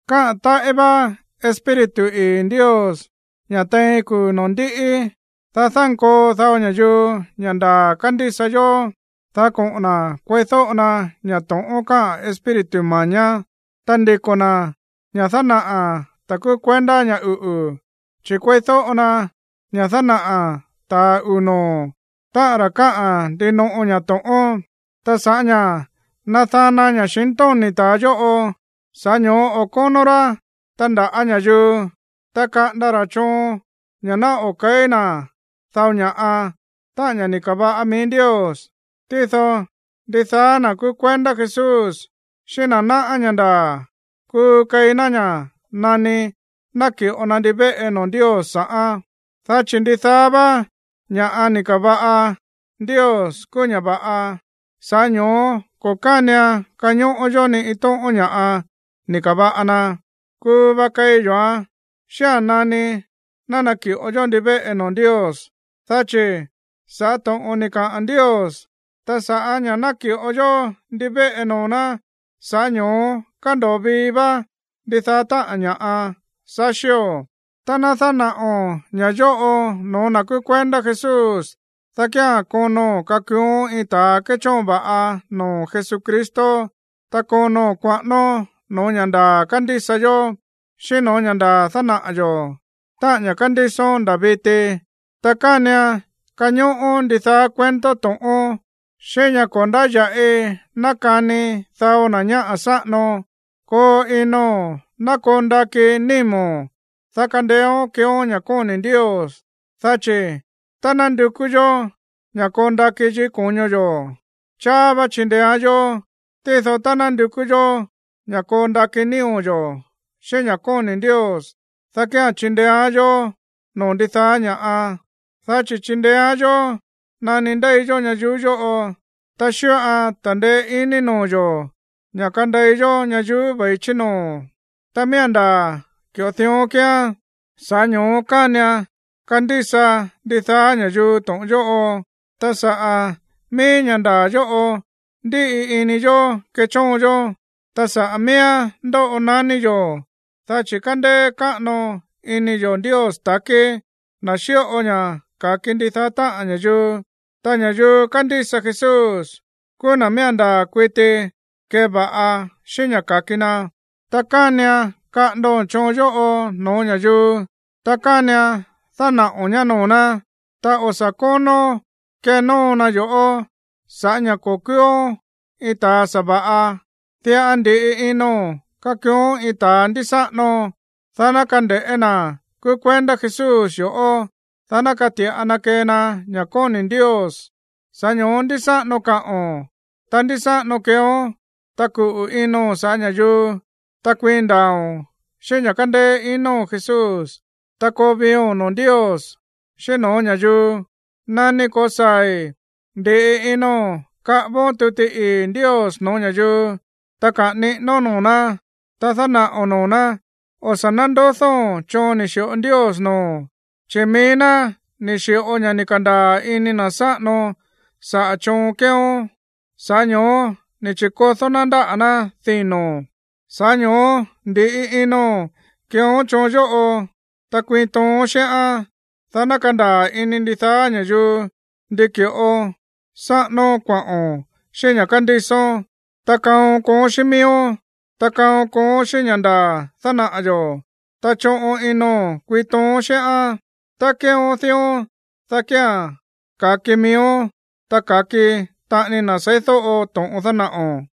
Káꞌa̱n táꞌí vá Espíritu ii̱ Ndios ña̱ tein kuu̱ noo̱ ndíꞌí, dá dánkoo dao ña̱yuu ña̱ ndaa̱ kándísa yó, dá koꞌo̱n na̱ kueídóꞌo na ña̱ to̱ꞌón káꞌa̱n espíritu mañá, ta ndiko̱ na̱ ña̱ dánaꞌa̱ ta̱ kúú kuendá ña̱ uꞌu̱, chi̱ kueídóꞌo na ña̱ dánaꞌa̱ ta̱a uu̱ noo̱, táꞌa̱n ra̱ káꞌa̱n ndinoꞌo ña̱ to̱ꞌón. Ta sa̱ꞌá ña̱ nadana ña̱xintóni̱ ta̱a yóꞌo, sa̱ꞌá ño̱ó o̱ kónó rá tandaꞌa̱ ña̱yuu, ta kaꞌanda ra̱ choon ña̱ ná o̱ ke̱í na̱ dao ña̱ꞌa, táꞌa̱n ña̱ ni̱ ka̱va̱ꞌa mií Ndios, tído ndidaá na̱ kúú kuendá Jesús xíꞌín na̱ náꞌá ña̱ ndaa̱ kuu keí ná ña̱ nani naki̱ꞌo na ndivéꞌe noo̱ Ndios sa̱ꞌán. Dá chi̱ ndidaá vá ña̱ꞌa ni̱ ka̱va̱ꞌa Ndios kúú ña̱ va̱ꞌa. Sa̱ꞌá ño̱ó ko̱ kánian kañóꞌó yó ni iin tóꞌón ña̱ꞌa ni̱ ka̱va̱ꞌa na. Kuu va keí yo̱án xía̱n nani naki̱ꞌo yó ndivéꞌe noo̱ Ndios. Dá chi̱ sa̱ꞌá to̱ꞌon ni̱ kaꞌa̱n Ndios, ta sa̱ꞌá ña̱ náki̱ꞌo yó ndivéꞌe noo̱ ná, sa̱ꞌá ño̱ó kándo̱o vii vá ndidaá táꞌa̱n ña̱ꞌa saxío̱. Tá ná dánaꞌo̱n ña̱ yóꞌo no̱ó na̱ kúú kuendá Jesús, dá kía̱n kono̱n kakuuón iin ta̱a kéchóon va̱ꞌa noo̱ Jesucristo, ta kono̱n kuaꞌánón no̱ó ña̱ ndaa̱ kándísa yó, xíꞌín no̱ó ña̱ ndaa̱ dánaꞌa̱ yo̱, táꞌa̱n ña̱ kándísón nda̱ viti. Ta kánian kañóꞌón ndidaá cuento to̱ꞌón xíꞌín ña̱ ko̱ ndáya̱ꞌi nákani dao na̱ ñáꞌa̱ sáꞌano. Koo ino̱n ná koo ndakí nímo̱n, dá kandeéón keeón ña̱ kóni̱ Ndios. Dá chi̱ tá ná ndukú yó ña̱ koo ndakí yikí ko̱ño yo̱, cháá vá chindeéán yó. Tído tá ná ndukú yó ña̱ koo ndakí nío̱ yo̱ xíꞌín ña̱ kóni̱ Ndios, dá kía̱n chindeéán yó noo̱ ndidaá ña̱ꞌa, dá chi̱ chindeéán yó nani ndéi yó ñayuú yóꞌo, ta xíꞌoan ta̱ndeé iní noo̱ yo̱ ña̱ kandei yó ñayuú ve̱i chí noo̱. Ta miía̱n ndaa̱ ki̱ꞌo dión kíán, sa̱ꞌá ño̱ó kánian kandísa ndidaá ña̱yuu to̱ꞌon yóꞌo. Ta saꞌa̱ mií ña̱ ndaa̱ yóꞌo ndíꞌi ini yo̱ kéchóon yó, ta sa̱ꞌá mííán ndóꞌo naní yo̱, dá chi̱ kándéé káꞌano ini yo̱ Ndios ta̱kí, na̱ xíꞌo ña̱ ka̱ki ndidaá táꞌa̱n ña̱yuu, ta ña̱yuu kándísa Jesús kúú na̱ miía̱n ndaa̱ kuiti keva̱ꞌa xíꞌín ña̱ ka̱ki na. Ta kánian kaꞌa̱ndo̱n choon yóꞌo no̱ó ña̱yuu, ta kánian dánaꞌo̱n ñá noo̱ ná. Ta o̱ sa̱ kónón kenóo na yo̱ꞌó sa̱ꞌá ña̱ ko̱ kúúón iin ta̱a sa̱va̱ꞌa. Diꞌa ndi̱ꞌi ino̱n kakuuón iin ta̱ ndísáꞌano, dá ná kande̱ꞌé na̱ kúú kuendá Jesús yo̱ꞌó, dá ná kati̱ꞌa na kee na ña̱ kóni̱ Ndios. Sa̱ꞌá ño̱ó ndísáꞌano kaꞌo̱n, ta ndísáꞌano keeón, ta kuꞌu̱ ino̱n saꞌa̱ ña̱yuu, ta kuiin ndaa̱o̱n xíꞌín ña̱ kándéé ino̱n Jesús, ta koo viio̱n noo̱ Ndios, xíꞌín no̱ó ña̱yuu. Nani ko̱saa̱i̱, ndi̱ꞌi ino̱n kaꞌávón tuti ii̱ Ndios no̱ó ña̱yuu, ta kaꞌa̱n niꞌínón noo̱ ná, ta dánaꞌo̱n noo̱ ná. O̱ sa̱ nándodóo̱n choon ni̱ xi̱ꞌo Ndios noo̱o̱n, chi̱ mií ná ni̱ xi̱ꞌo ña̱ ni̱ ka̱ndaa̱ ini na̱ sáꞌano sa̱ꞌá choon keeón, sa̱ꞌá ño̱ó ni̱ chi̱kodó ná ndáꞌa̱ ná dino̱n. Sa̱ꞌá ño̱ó ndi̱ꞌi ino̱n keeón choon yóꞌo, ta kuiin toon xíꞌán, dá ná kandaa̱ ini ndidaá ña̱yuu ndi ki̱ꞌo sáꞌánón kuaꞌo̱n xíꞌín ña̱ kándísón. Ta kaon kooón xíꞌín miíón, ta kaon kooón xíꞌín ña̱ ndaa̱ dánaꞌa̱ yo̱, ta choꞌon ino̱n kuiin toon xíꞌán. Tá keeón dión, dá kía̱n ka̱ki miíón, ta ka̱ki taꞌani na̱ seídóꞌo to̱ꞌon dánaꞌo̱n.